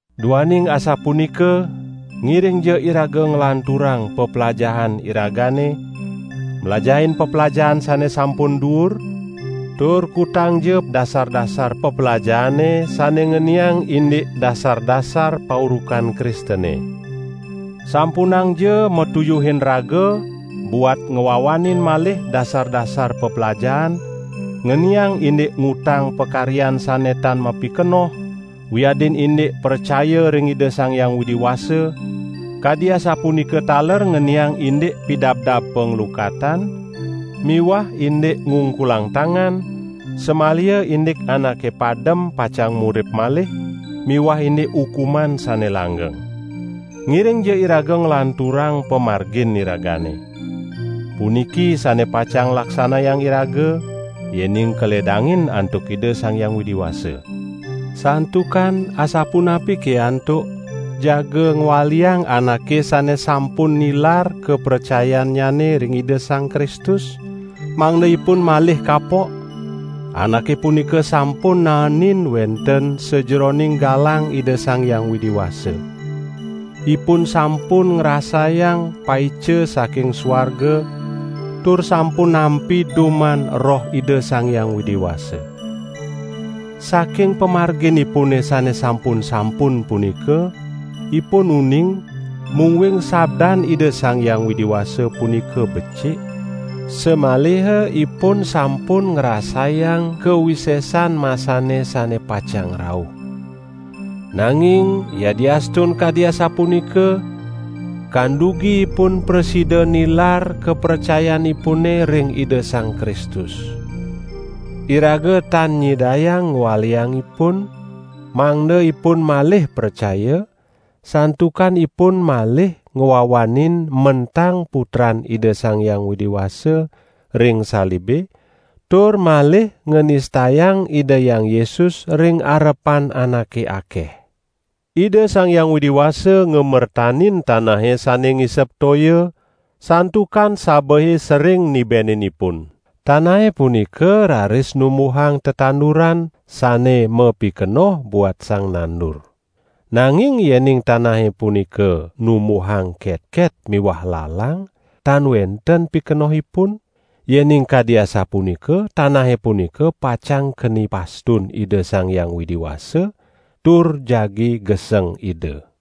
Duaning asapunika ngiringja iraga nglanturang peplajahan iragane mlajahin peplajahan sane sampun duur, tur kutangja dasar-dasar peplajahane sane ngeniang indik paurukan Kristene. Sampunangja matuyuhin raga buat ngwawanin malih dasar-dasar peplajahan ngeniang indik ngutang pakaryan sane tan mapikenoh, wiadin indik pracaya ring Ida Sang Hyang Widi Wasa; kadi asapunika taler ngeniang indik pidabdab panglukatan miwah indik ngungkulang tangan; samaliha indik anake padem pacang murip malih miwah indik ukuman sane langgeng. Ngiringja iraga nglanturang pamargin iragane. Puniki sane pacang laksanayang iraga yening kaledangin antuk Ida Sang Hyang Widi Wasa. Santukan asapunapike antuk jaga ngwaliang anake sane sampun nilar kapracayannyane ring Ida Sang Kristus, mangda ipun malih kapok? Anake punika sampun naenin wenten sajeroning galang Ida Sang Hyang Widi Wasa. Ipun sampun ngrasayang paica saking suarga tur sampun nampi duman Roh Ida Sang Hyang Widi Wasa. Saking pamarginipune sane sampun-sampun punika, ipun uning, mungguing sabdan Ida Sang Hyang Widi Wasa punika becik, samaliha ipun sampun ngrasayang kawisesan masane sane pacang rauh. Nanging yadiastun kadi asapunika, kandugi ipun prasida nilar kapracayanipune ring Ida Sang Kristus. Iraga tan nyidayang ngwaliang ipun, mangda ipun malih pracaya, santukan ipun malih ngwawanin mentang Putran Ida Sang Hyang Widi Wasa ring salibe tur malih nganistayang Ida Hyang Yesus ring arepan anake akeh. Ida Sang Hyang Widi Wasa ngamertanin tanahe sane ngisep toya santukan sabehe sering nibenin ipun. Tanahe punika raris numbuhang tetanduran sane mapikenoh buat sang nandur. Nanging yening tanahe punika numbuhang ketket miwah lalang tan wenten pikenohipun; yening kadi asapunika tanahe punika pacang keni pastun Ida Sang Hyang Widi Wasa tur jagi geseng Ida.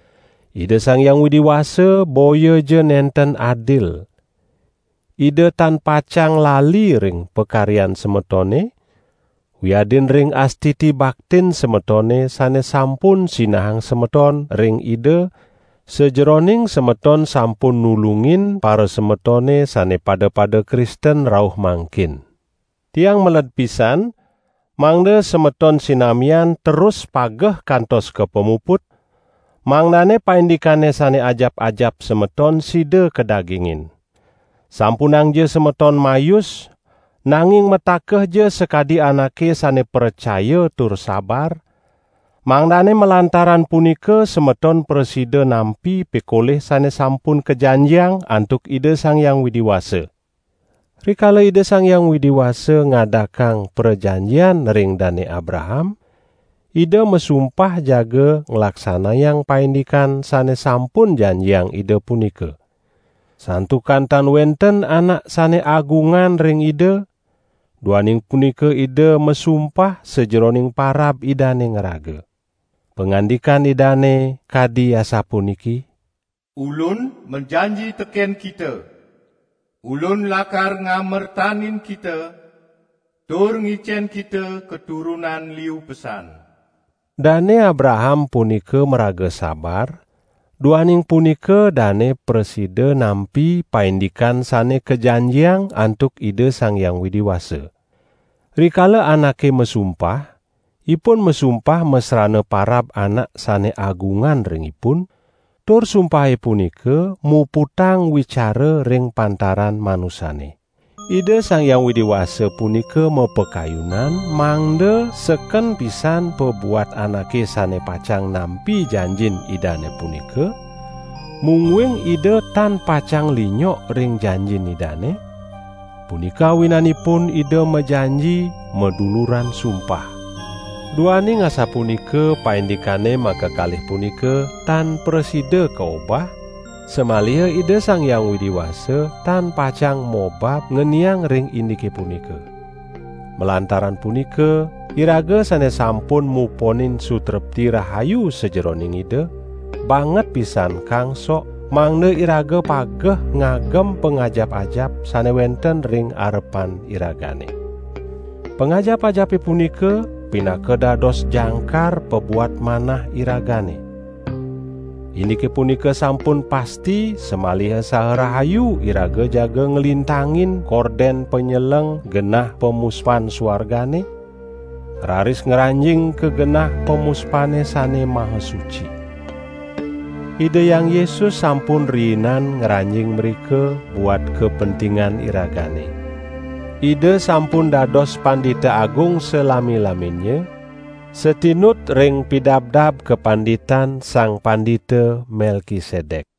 Ida Sang Hyang Widi Wasa boyaja nenten adil. Ida tan pacang lali ring pakaryan semetone, wiadin ring astiti baktin semetone sane sampun sinahang semeton ring Ida sajeroning semeton sampun nulungin parasemetone sane pada-pada Kristen rauh mangkin. Tiang meled pisan, mangda semeton sinamian terus pageh kantos ka pamuput, mangdane paindikane sane ajap-ajap semeton sida kadagingin. Sampunangja semeton mayus, nanging matakehja sakadi anake sane pracaya tur sabar, mangdane malantaran punika semeton prasida nampi pikolih sane sampun kajanjiang antuk Ida Sang Hyang Widi Wasa. Rikala Ida Sang Hyang Widi Wasa ngadakang prajanjian ring Dane Abraham, Ida masumpah jaga nglaksanayang paindikan sane sampun janjiang Ida punika. Santukan tan wenten anak sane agungan ring Ida, duaning punika Ida masumpah sajeroning parab Idane ngraga. Pangandikan Idane kadi asapuniki: "Ulun majanji teken kita; Ulun lakar ngamertanin kita tur ngicen kita katurunan liu pesan." Dane Abraham punika maraga sabar, duaning punika dane prasida nampi paindikan sane kajanjiang antuk Ida Sang Hyang Widi Wasa. Rikala anake masumpah, ipun masumpah masrana parab anak sane agungan ring ipun, tur sumpahe punika muputang wicara ring pantaran manusane. Ida Sang Hyang Widi Wasa punika mapakayunan, mangda seken pisan pabuat anake sane pacang nampi janjin Idane punika, mungguing Ida tan pacang linyok ring janjin Idane, punika awinanipun Ida majanji maduluran sumpah. Duaning asapunika paindikane makakalih punika tan prasida kaobah, samaliha Ida Sang Hyang Widi Wasa tan pacang mobab ngeniang ring indike punika. Malantaran punika, iraga sane sampun muponin sutrepti rahayu sajeroning Ida, banget pisan kangsok mangda iraga pageh ngagem pangajap-ajap sane wenten ring arepan iragane. Pangajap-ajape punika pinaka dados jangkar pabuat manah iragane. Indike punika sampun pasti samaliha saha rahayu iraga jaga nglintangin korden panyeleng genah pamuspan suargane, raris ngranjing ka genah pamuspane sane maha suci. Ida Hyang Yesus sampun riinan ngranjing mrika buat kapentingan iragane. Ida sampun dados Pandita Agung salami-laminnya, satinut ring pidabdab kapanditan Sang Pandita Melkisedek.